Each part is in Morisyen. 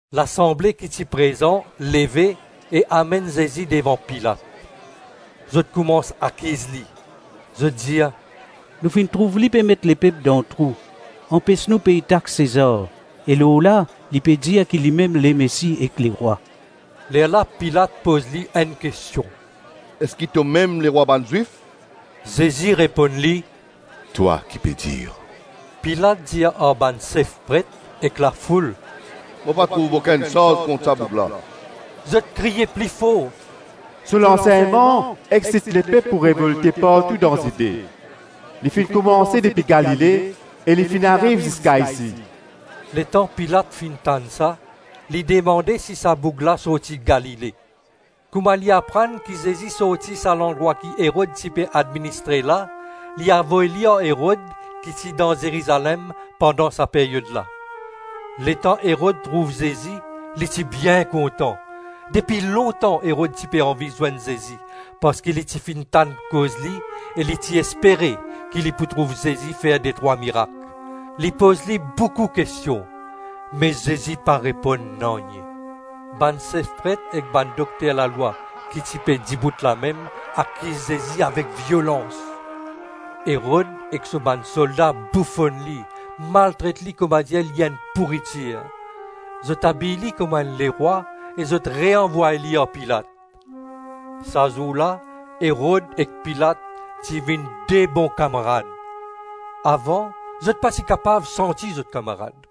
Lasanble ki ti prezan leve e amenn Zezi devan Pilat. Zot koumans akiz li. Zot dir, “Nou finn trouv li pe met lepep dan trou, anpes nou pey tax Sezar, e lorla li pe dir ki limem Lemesi ek lerwa.” Lerla Pilat poz li enn kestion, “Eski tomem Lerwa bann Zwif?” Zezi reponn li, “Twa ki pe dir.” Pilat dir ar bann sef pret ek lafoul, “Mo pa trouv okenn sarz kont sa boug la.” Zot kriy pli for, “So lansegnman exsit lepep pou revolte partou dan Zide; li finn koumanse depi Galile e li finn ariv ziska isi.” Letan Pilat finn tann sa, li demande si sa boug la sorti Galile. Kouma li aprann ki Zezi sorti sa landrwa ki Erod ti pe administre la, li avoy li ar Erod ki ti dan Zerizalem pandan sa peryod la. Letan Erod trouv Zezi, li ti bien kontan. Depi lontan Erod ti pe anvi zwenn Zezi parski li ti finn tann koz li e li ti espere ki li pou trouv Zezi fer detrwa mirak. Li poz li boukou kestion me Zezi pa reponn nanye. Bann sef pret ek bann dokter lalwa ki ti pe dibout lamem akiz Zezi avek violans. Erod ek so bann solda boufonn li, maltret li koumadir li enn pouritir. Zot abiy li kouma enn lerwa e zot reanvway li ar Pilat. Sa zour la Erod ek Pilat ti vinn de bon kamarad; avan zot pa ti kapav santi zot kamarad.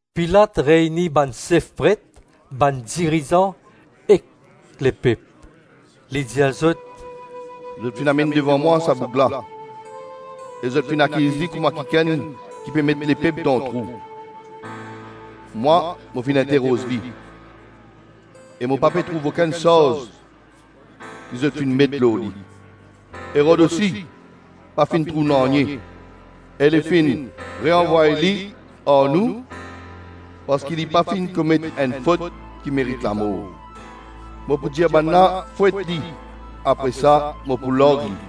Pilat reyni bann sef pret, bann dirizan ek lepep. Li dir zot, “Zot finn amenn devan mwa sa boug la e zot finn akiz li kouma kikenn ki pe met lepep dan trou. Mwa mo finn interoz li, e mo pa pe trouv okenn sarz ki zot finn met lor li. Erod osi pa finn trouv nanye e li finn reanvway li ar nou parski li pa finn komet enn fot ki merit lamor. Mo pou dir bannla fwet li apre sa mo pou larg li.”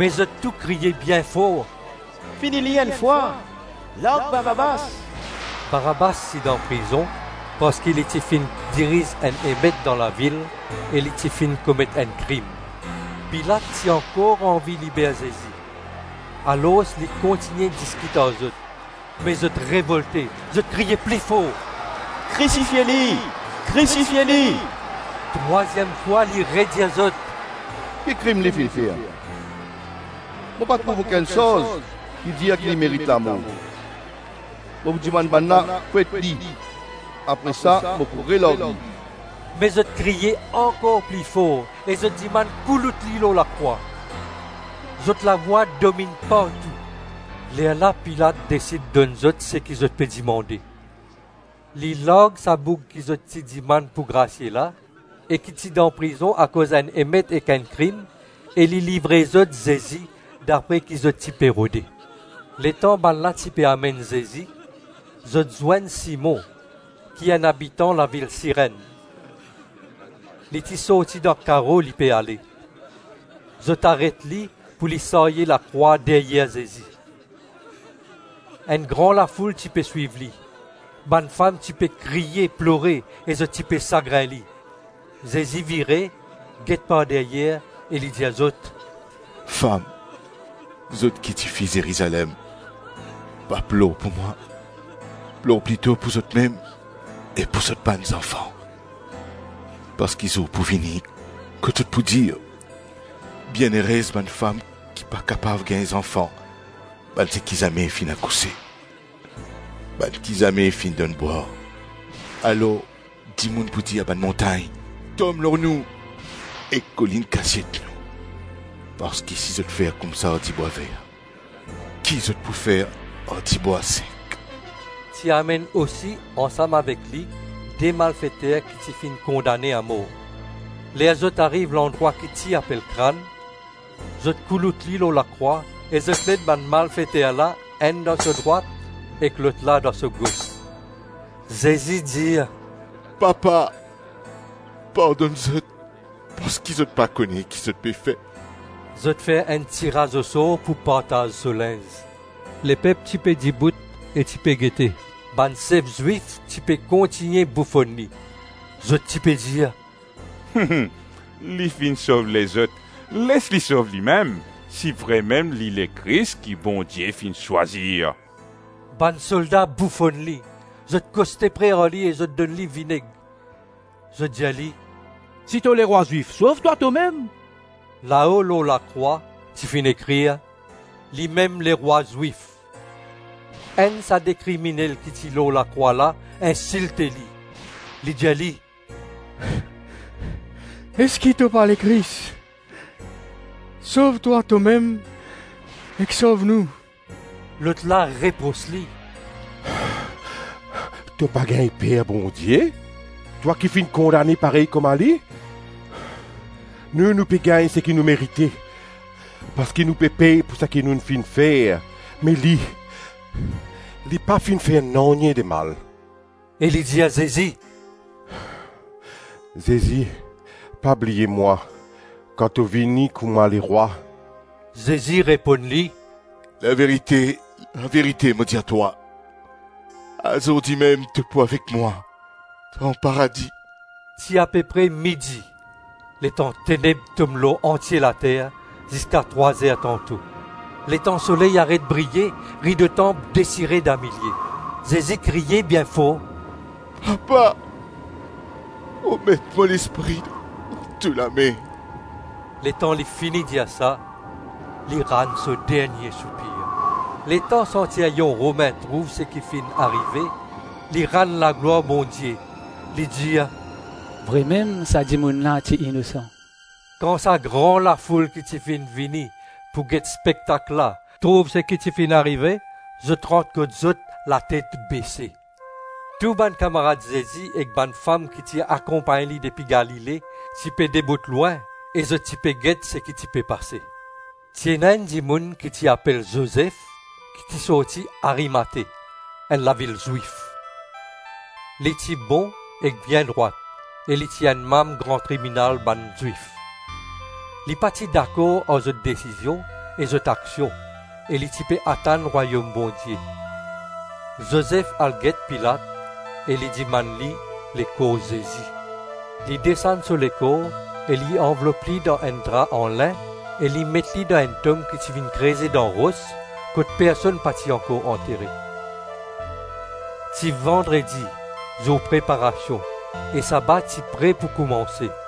Me zot tou kriye bien for, “Fini li enn fwa, larg Barabas.” Barabas ti dan prizon parski li ti finn diriz enn emet dan lavil e li ti finn komet enn krim. Pilat ti ankor anvi liber Zezi, alors li kontigne diskit ar zot. Me zot revolte, zot kriye pli for, “Krisifie li! Krisifie li!” Trwaziem fwa, li redir zot, “Ki krim li finn fer? Mo pa trouv okenn sarz ki dir ki li merit lamor. Mo pou dimann bannla fwet li apre sa mo pou relarg li.” Me zot kriye ankor pli for e zot dimann koulout li lor lakrwa. Zot lavwa dominn partou. Lerla Pilat desid donn zot seki zot pe dimande. Li larg sa boug ki zot ti dimann pou grasie la, e ki ti dan prizon akoz enn emet ek enn krim, e li livre zot Zezi dapre ki zot ti pe rode. Letan bannla ti pe amenn Zezi, zot zwenn Simon ki enn abitan lavil Sirenn. Li ti sorti dan karo, li pe ale. Zot aret li pou li sarye lakrwa deryer Zezi. Enn gran lafoul ti pe swiv li; bann fam ti pe kriye, plore e zot ti pe sagrin li. Zezi vire, get par deryer e li dir zot, “Fam, zot ki tifi Zerizalem, pa plor pou mwa. Plor plito pou zotmem e pou zot bann zanfan. Parski zour pou vini kot zot pou dir, ‘Bienerez bann fam ki pa kapav gagn zanfan, bann seki zame finn akouse, bann ki zame finn donn bwar.’ Alor dimoun pou dir bann montagn, Tom lor nou, ek kolinn Kasiet nou, Parski si zot fer koumsa ar dibwa ver, ki zot pou fer ar dibwa sek?” Ti amenn osi ansam avek li de malfeter ki ti finn kondane amor. Ler zot ariv landrwa ki ti apel Krann, zot koulout li lor lakrwa e zot met bann malfeter la, enn dan so drwat ek lotla dan so gos. Zezi dir, “Papa pardonn zot parski zot pa kone ki zot pe fer.” Zot fer enn tiraz osor pou partaz so linz. Lepep ti pe dibout e ti pe gete. Bann sef Zwif ti pe kontigne boufonn li. Zot ti pe dir, “Li finn sov lezot; les li sov limem si vremem li Lekris ki Bondie finn swazir.” Bann solda boufonn li. Zot koste pre ar li e zot donn li vineg. Zot dir li, “Si to Lerwa Zwif, sov twa tomem.” Lao lor lakrwa ti finn ekrir, “Limem Lerwa Zwif.” Enn sa de kriminel ki ti lor lakrwa la insilte li. Li dir li, “Eski to pa Lekris? Sov twa tomem ek sov nou.” Lotla repros li, “To pa gagn per Bondie, twa ki finn kondane parey kouma li? Nou, nou pe gagn seki nou merite parski nou pe pey pou seki nou finn fer, me li, li pa finn fer nanye de mal.” E li dir Zezi, “Zezi pa bliye mwa kan to vini kouma Lerwa.” Zezi reponn li, “Laverite, laverite mo dir twa, azordi mem to pou avek mwa dan paradi.” Ti apepre midi, letan teneb tom lor antie later ziska trwa-zer tanto. Letan soley aret briye, rido tanp desire damilie. Zezi kriye bien for, “Papa, mo met mo lespri dan to lame.” Letan li fini dir sa, li rann so dernie soupir. Letan santiryon Romin trouv seki ti finn arive, li rann laglwar Bondie, li dir, “Vremem sa dimoun la ti inosan.” Kan sa gran lafoul ki ti finn vini pou get spektak la trouv seki ti finn arive, zot rant kot zot latet bese. Tou bann kamarad Zezi ek bann fam ki ti akonpagn li depi Galile ti pe dibout lwin e zot ti pe get seki ti pe pase. Ti ena enn dimoun ki ti apel Zozef ki ti sorti Arimate, enn lavil Zwif. Li ti bon ek bien drwat e li ti enn manm Gran Tribinal bann Zwif. Li pa ti dakor ar zot desizion e zot aksion, e li ti pe atann Rwayom Bondie. Zozef al get Pilat e li dimann li lekor Zezi. Li desann so lekor e li anvlop li dan enn dra an lin e li met li dan enn tom ki ti finn kreze dan ros kot personn pa ti ankor antere. Ti vandredi, zour Preparasion, e saba ti pre pou koumanse.